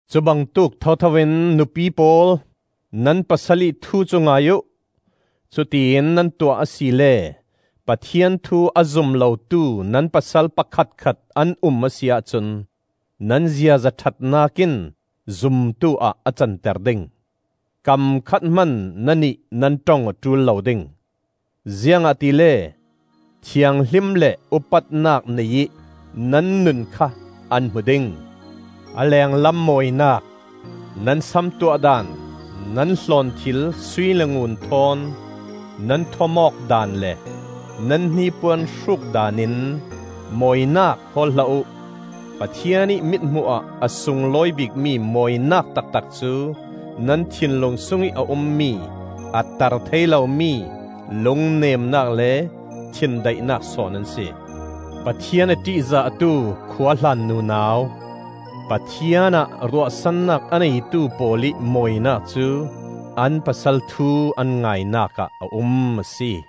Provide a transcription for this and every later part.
Cubangtuk thothoin nupi pawl, nan pasal ih thu cu ngai uh; cutiin nan tuah asile Pathian thu a zum lotu nan pasal pakhatkhat an um a si ahcun nan ziaza ṭhatnak in zumtuah a canter ding. Kam khat hman nannih nan ṭong a ṭul lo ding, ziangahtile, thianghlim le upatnak nei ih nan nun kha an hmu ding. A lenglam mawinak: nan sam tuah daan, nan hlawnthil sui le ngun thawn nan thuam awk daan le nan hnipuan hruk daan in mawinak hawl hlah uh. Pathian ih mithmuh ah a sunglawi bikmi mawinak taktak cu nan thinlung sungih a ummi a tar thei lomi lungnemnak le thindaihnak sawn an si. Pathian a ṭihzahtu khuahlan nunau, Pathian ah ruahsannak a neitu pawl ih mawinak cu an pasal thu an ngainak ah a um a si.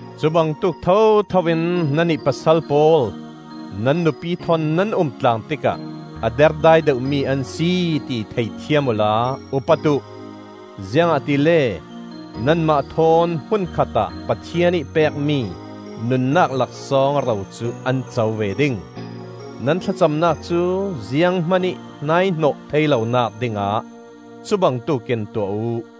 Cubangtuk thothoin nannih pasal pawl, nan nupi thawn nan umtlang tikah a derdai deuhmi an si ti thei thiam uhla upat uh, ziangahtile nanmah thawn hmun khatah Pathian ih pekmi nunnak laksawng ro cu an co ve ding. Nan thlacamnak cu ziang hmanih hnaihnawh thei lonak dingah cu bangtuk in tuah uh.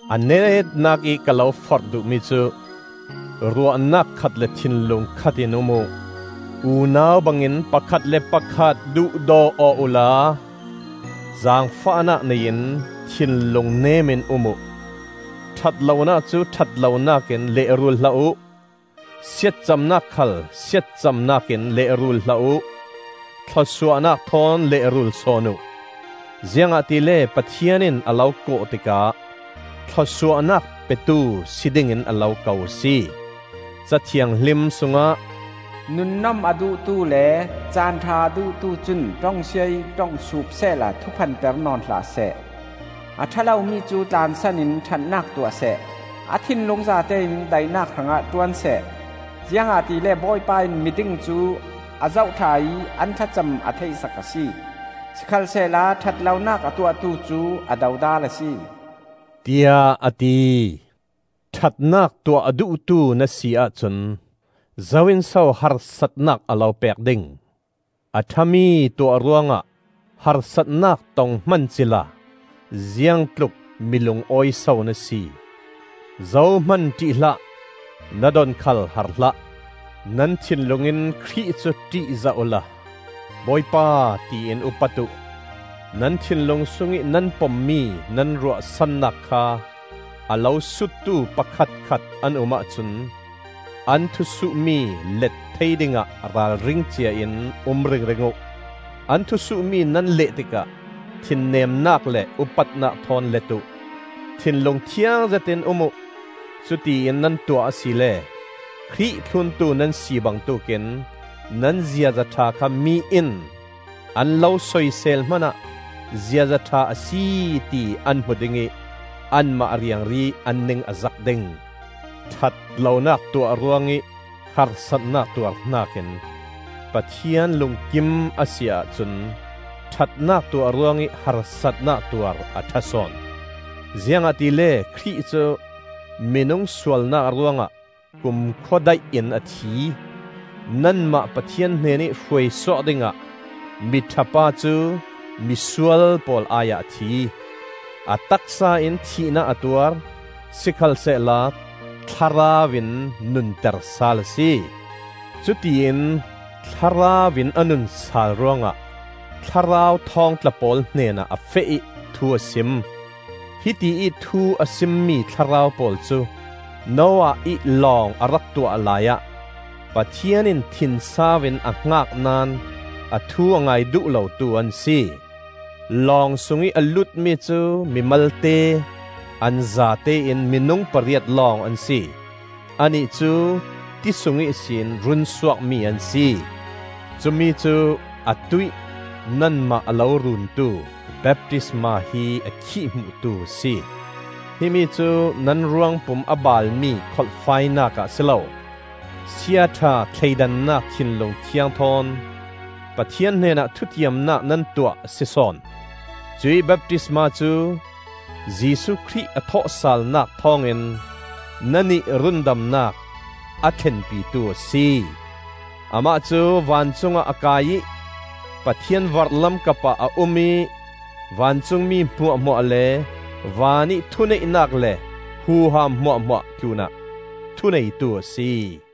A netnak ih ka lo forh duhmi cu: ruahnak khat le thinlung khatión um uh; unau bangin pakhat le pakhat duhdaw aw uhla zaangfahnak nei in thinlung nemin um uh. Ṭhat lonak cu ṭhat lonak in lehrul hlah uh, siatcamnak khal siatcamnak in lehrul hlah uh; thlawsuahnak thawn lehrul sawn uh. Ziangahtile Pathian in a lo kawh tikah thlawsuahnak petu si dingin a lo ko a si. Ca Thianghlim sungah, “Nunnom a duhtu le caan ṭha a duhtu cun ṭongsia ih ṭong sup sehla thuphan per nawn hlah seh. “A ṭha lomi cu tlansan in ṭhatnak tuah seh. A thinlung zatein daihnak hrangah ṭuan seh. Ziangahtile Bawipa in miding cu a zoh ṭha ih an thlacam a theihsak a si. Sikhalsehla ṭhat lonak a tuahtu cu a dodal a si,” tiah a ti. Ṭhatnak tuah a duhtu na si ahcun zo in so harsatnak a lo pek ding? A ṭhami tuah ruangah harsatnak tong hman cila ziang tlukmi lungawi so na si! Zohman ṭih hlah; na don khal har hlah. Nan thinlung in Khrih cu ṭihzah uhla Bawipa tiin upat uh. Nan thinlung sungih nan pommi nan ruahsannak kha a lo suttu pakhatkhat an um ahcun an thusuhmi let thei dingah ralring ciain um ring ring uh. An thusuhmi nan leh tikah thinnemnak le upatnak thawn let uh. Thinlung thiang zetin um uh; cutiin nan tuah asile Khrih thluntu nan si bangtuk in nan ziaza ṭha kha mi in an lo soisel hmanah ziaza ṭha a si ti an hmu ding ih anmah riangri an ning a zak ding. Ṭhat lonak tuah ruangih harsatnak tuar hnakin Pathian lungkim a si ahcun ṭhatnak tuah ruangih harsatnak tuar a ṭha sawn. Ziangahtile Khrih cu minung sualnak ruangah kumkhua daih in a thi; nanmah Pathian hnenih hruaisuak dingah miṭha pa cu misual pawl ai ah a thi. A taksa in thihnak a tuar, sikhalsehla thlarau in nunter sal a si. Cutiin thlarau in a nun sal ruangah thlarau thawngtla pawl hnenah a feh ih thu a sim. Hitiih thu a simmi thlarau pawl cu Noah ih lawng a rak tuah laiah Pathian in thinsau in a hngak naón a thu a ngai duh lotu an si. Long sungih a lutmi cu mi malte, an zatein minung pariat lawng an si; annih cu ti sung ihsin runsuakmi an si. Cumi cu atuih nanmah a lo runtu baptisma hi a khihhmuhtu a si. Himi cu nan ruangpum a baalmi kholhfainak ah a si lo, siaṭha thleidannak thinlung thiang thawn Pathian hnenah thutiamnak nan tuah a si sawn. Cuih baptisma cu Jesuh Khrih a thawhsalnak thawngin nannih rundamnak a thlenpitu a si. Amah cu vancungah a kai ih Pathian vorhlam kapah a um ih vancung mi hmuahhmuah le vanih thuneihnak le huham hmuahhmuah tlunah thuneitu a si.